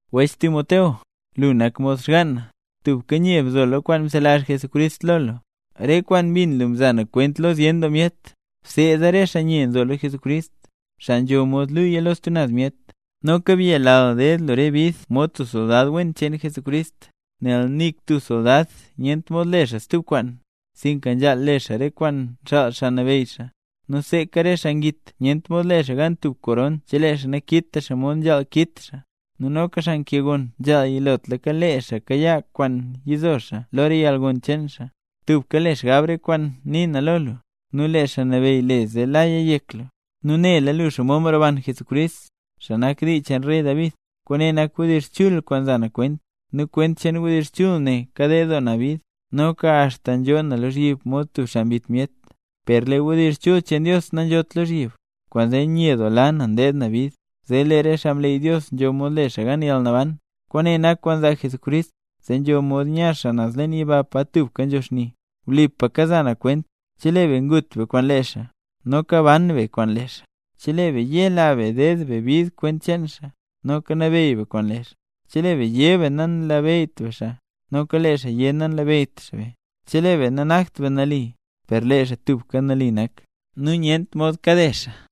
Wech Timoteo, lu nak mod xgaan na. Tubka nye bzo lo kwaan mzelazh Jesucrist lo lu. Re kwaan mbin lu mza na kwent lo zyen doo myet, bseeda re xaa nye nzo lo Jesucrist, xaa nzho mod luuya lo stub naz myet. Noka byelal ded lu re bid mod tub soldad wen cheen Jesucrist. Nel nik tub soldad nyent mod le xaa stub kwaan, sinka nzhaal le xaa re kwaan nxaal xaa nabeyy xaa. Nu seeka re xaa ngit, nyent mod le xaa gan tub koron chelee xaa nakit xaa mod nzhaal kit xaa. Nu noka xaa nkee ngonn nzhaal yilotlaka kayaa yizo xaa lo yalgon cheen xaa. Tubka le xgab re kwaan nii na lo lu, nu lee Xaa Nabeyy le zee laya yek lu. Nu nela lu xomod mroban Jesucrist, xaa nak dii cheen rey David. Kwaane nak wdizh chul kwaan nza na kwent. Nu kwent cheen wdizh chul ne kaded doo na bid, noka axta nzhoo na lozhyib mod tub xaa mbit myet. Per lee wdizh chul cheen Dios nanzhot lozhyib. Kwaanzee nyedoola na ndeed na bid, zee lee re xaa mleey Dios nzho mod le xaa gan yalnaban, kwaane nak kwaan nzaa Jesucrist, zee nzho mod nya xaa naz leen yiba pa tubka nzho xni. Wlipa kaza na kwent: Chelee be ngut be kwaan lee xaa, noka ban be kwaan lee xaa; chelee be tubka yela be ded be bid kwent cheen xaa, noka nabeyy be kwaan lee xaa. Chelee be yé be nanlabeyyt be xaa, noka lee xaa yé nanlabeyyt xaa be. Chelee be nanakt be nali, per lee xaa tubka nali nak, nu nyent mod kade xaa.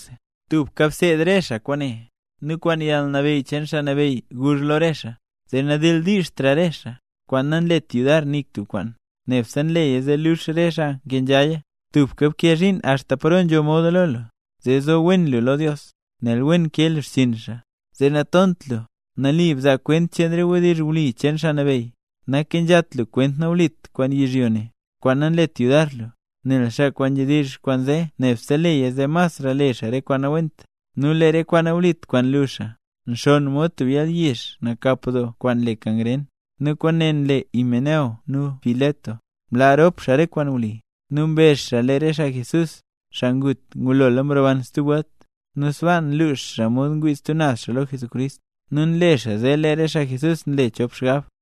Tubka bseed re xaa kwaane, nu kwaan yalnabeyy cheen Xaa Nabeyy guzh lo re xaa, zee nadildiizht re xaa, kwaan nanlet yudar nik tub xaa, nebse nleya zee luux re xaa nkenzhaya. Tubka bkee zhiin axta paro nzho moda lo lu, zee zo wen lu lo Dios; nel wen nkee lu xchiin xaa, zee natont lu. Nali bzaa kwent cheen re wdizh wli cheen Xaa Nabeyy. Nakenzhat lu kwent nawlit kwaan yizhyo ne, kwaan nanlet yudar lu. Nel xaa kwaan nzhedizh kwaan zee nebse leya zee masra le xaa re kwaan nawent. Nu lee re kwaan nawlit kwaan nlu xaa, nxonn mod tub yalyizh nakap doo kwaan le kangren. Nu kwaane nle Himeneo nu Fileto. Mlaa rop xaa re kwaan wli, nu mbezh xaa lee re xaa Jesús, xaa ngut, ngulola mroban stub welt. Nu sbaa nlux xaa mod ngwii stub naz xaa lo Jesucrist, nu nle xaa zee lee re xaa Jesús nle chop xgab.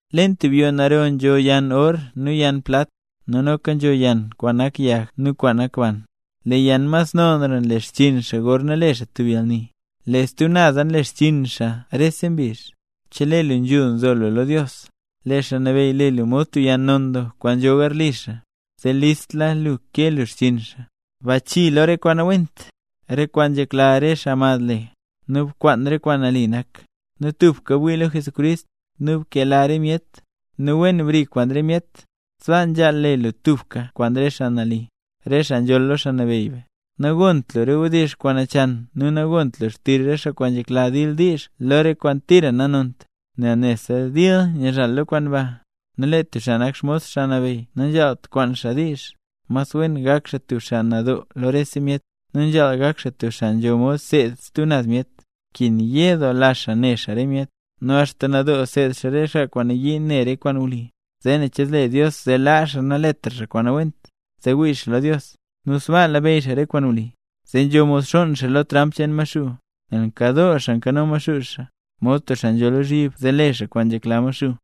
Leen tub yoo naro nzho yann or nu yann plat, nu noka nzho yann kwaan nak yag nu kwaan nak ban. Lee yann mas nonra nle xchiin xaa gorna le xaa tub yalni, lee stub naza nle xchiin xaa rese mbizh. Chelee lu nzhul nzo lu lo Dios, lee Xaa Nabeyy le lu mod tub yann non doo kwaan nzho garli xaa, zee listla lu kee lu xchiin xaa. Bachii lo re kwaan nawent, re kwaan nzhekla re xaa mad le, nu bkwaan re kwaan nali nak, nu tubka bwii lo Jesucrist, nu bkela re myet, nu wen bri kwaan re myet; sbaa nzhaal le lu tubka kwaan re xaa nali, re xaa nzholl lo Xaa Nabeyy be. Nagont lu re wdizh kwaan nachan nu nagont lu xtizh re xaa kwaan nzhekla dildiizh lo rese kwaan tira nanont, nel nebse dil nyizhal lo kwaan ba. Nu lee tub xaa nak xmos Xaa Nabeyy nanzhaalt kwaan xaa diizh, mas wen gak xaa tub xaa nadoo lo rese myet, nu nzhaal gak xaa tub xaa nzho mod seed stub naz myet, nkin yedoola xaa ne xaa re myet. Nu axta nadoo seed xaa re xaa kwaan nayii ne re kwaan wli, zee ne che zle Dios zee laa xaa naletra xaa kwaan nawent, zee wii xaa lo Dios, nu sbaa labeyy xaa re kwaan wli, zee nzho mod xonn xaa lo tramp cheen Maxuu. Nel nkadoo xaa nkano Maxuu xaa, mod tub xaa nzho lozhyib zee le xaa kwaan nzhekla Maxuu.